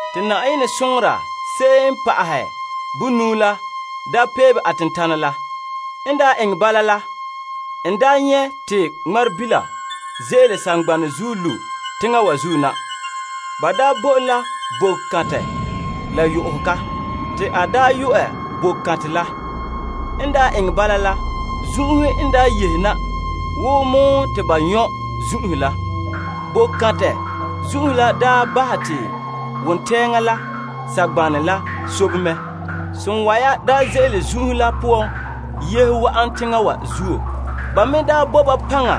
Te Yenɛ soŋora se'em n pa'ahɛ bonuu la daa peebe a tentanɛ la. N eŋɛ bala la, n nyɛ' te ŋmarebila ze'ele saŋgbanɛ zuo lu' teŋa wa zuo na. Ba bo en la boko kantɛ la kparehega. Te a yu'ɛ boko kantɛ la. N eŋɛ bala la, zun'uhe n yehe na wo mɔɔ te ba nyɔ' zun'uhe la. Boko kantɛ zun'uhe la daa bahɛ te wontɛɛŋa la saŋgbanɛ la sobe mɛ. Sonwa'ara ze'ele zun'uhe la poan yehe wa'an teŋa wa zuo. Ba me bo ba paŋa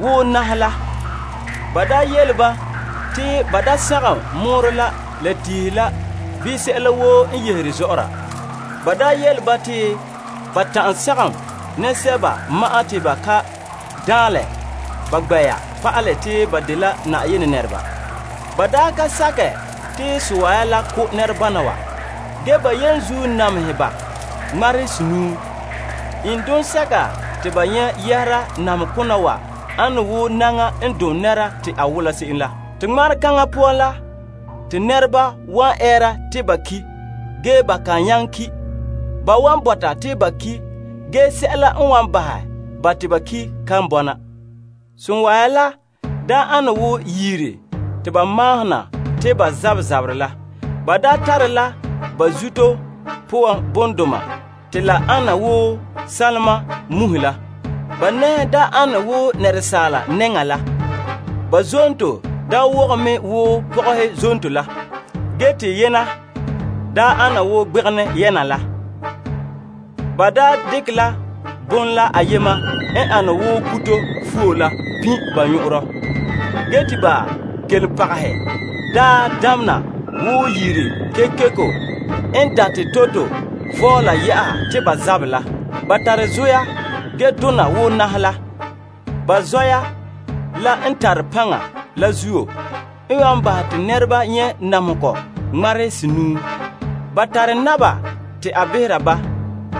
wo naŋhe la. Ba yele ba te ba da sagom mɔɔrɔ la la tiihe la bii sɛla woo n yehere zɔ'ɔra. Ba yele ba te ba ta'an sagom nɛresɛba ma'an te ba ka daanlɛ ba gbɛ'ɛra pa'alɛ te ba dela Yenɛ nɛreba. Ba ka sakɛ te sonwa'ara la ko' nɛrebana wa. Ge ba namehɛ ba ŋmarehe senuu. Iŋduma sɛka te ba nyɛ' yɛhera la namehe kona wa la ane wo naŋa n dom nɛra te a wɔla se'em la. Te ŋmaresene poan la, nɛreba wan ɛɛra te ba ki'. Ge ba kan nyaŋɛ ki'. Ba wan bɔta te ba ki', ge sɛla n wan bahɛ ba te ba ki' kan bɔna. Sonwa'ara la ane wo yiri te ba mahona te ba zabɛ zaberɛ la. Ba tare la ba zuto poan bondoma te la ane wo sanlema muhe la. Ba nɛhe ane wo asaala nɛŋa la. Ba zonto wogɛ mɛ wo pɔgɔhe zonto la. Ge te ba nyɛna ana wo gbegenɛ nyɛna la. Ba dekɛ la bon la ayema n ane wo kuto fuo la pin' ba nyɔn'ɔnrɔ. Ge te ba kelompagehe damena wo yiri kekeko n date toroto vɔɔla yɛ'a te ba zaberɛ la. Ba tare zoya ge dona wo naŋhe la. Ba zoya la n tare paŋa la zuo, n wan bahɛ te nɛreba nyɛ' namehegɔ ŋmarehe senuu. Ba tare naba te a behera ba.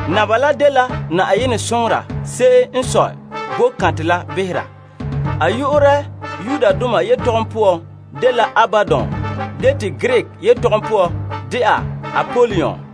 Naba la dela Yenɛ soŋora se'em n sɔe boko kantɛ la behera. A yu'urɛ Yudoma yetɔgom poan dela Abadon ge te Greek yetɔgom poan dɛna Apolion.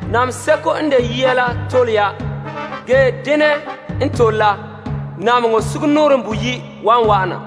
Namehe seko n de yia la tole ya. Ge dene n tole la, namehegɔ sugumnɔɔren boyi' wan wa'ana.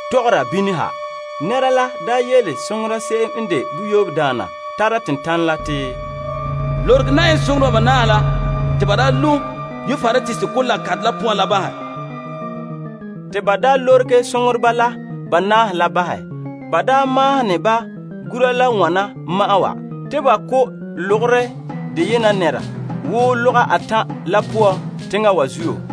Te konkore la yele soŋora se'em n de boyoobe daana la tara tentanɛ la yeti, Lorege Yenɛ soŋoreba banaahe la te ba daa lo' Euprates Kolaa kantɛ la poan la bahɛ. Te ba lorege soŋoreba la banaahe la bahɛ. Ba maahene ba gura la wana ma'an wa, te ba ko' lɔgɔrɛ deyena nɛreba woo lɔga atan' la poan teŋa wa zuo.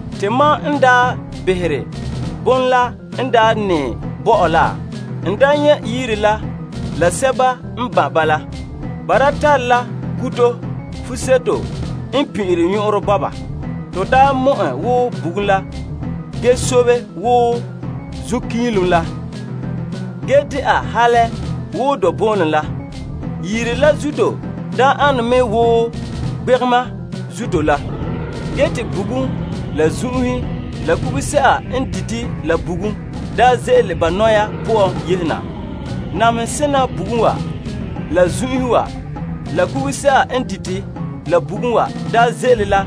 Te mam n behere bon la n daa nɛɛ bo mam la, n daa nyɛ' yiri la la sɛba n ban' ba la. Ba tare la kuto fuseto n pin'inre nyɔn'ɔn bɔba. To daa mɔ'ɛ wo bugum la, ge sobe wo zunkiilom la, ge ana wo dɔnboolom la. Yiri la zuto daa ane me wo gbegema zuto la. Ge te bugum, la zun'uhe, la kuguse'a n dite la bugum daa ze'ele ba nɔya poan yehe na. Bugum namehe kona wa, la zun'uhe wa, la kuguse'a n dite la bugum wa daa ze'ele la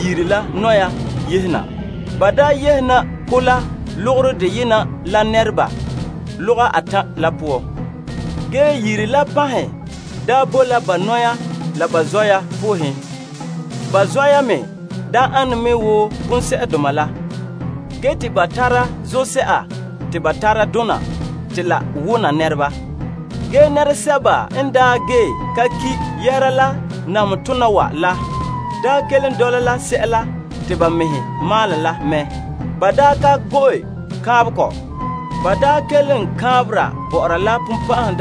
yiri la nɔya yehe na. Ba daa yehe na ko' la lɔgɔrɛ deyena la nɛreba lɔga atan' la poan. Ge yiri la panhen bo la ba nɔya la ba zoya poohen. Ba zoya me ane me wo bonsɛ'doma n tare zuto la, ge te ba tara zose'a te ba tara dona te la wona nɛreba. Ge nɛresɛba n gee la ka ki' yɛhera la namehe kona wa la, kelom dɔla la sɛla te ba mɛhe maalɛ la mɛ. Ba ka go'e kaanbegɔ. Ba kelom kaanbera bɔ'ɔra la bonbɛ'ɛhe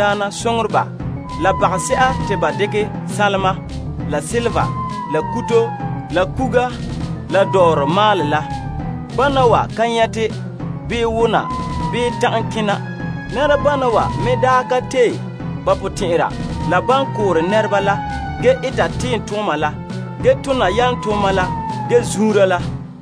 la bagase'a te ba dekɛ sanlema, la sanlenpeelega, la nyɔgom, la kuga, la dɔɔrɔ maalɛ la. Bana wa ka nyɛte, bii wona, bii ta'an kena. Nɛrebana wa daa ka tee ba potɛn'ɛra la ban koore nɛreba la, ge eta tiimtooma la, ge tona yalomtooma la, ge zuunra la.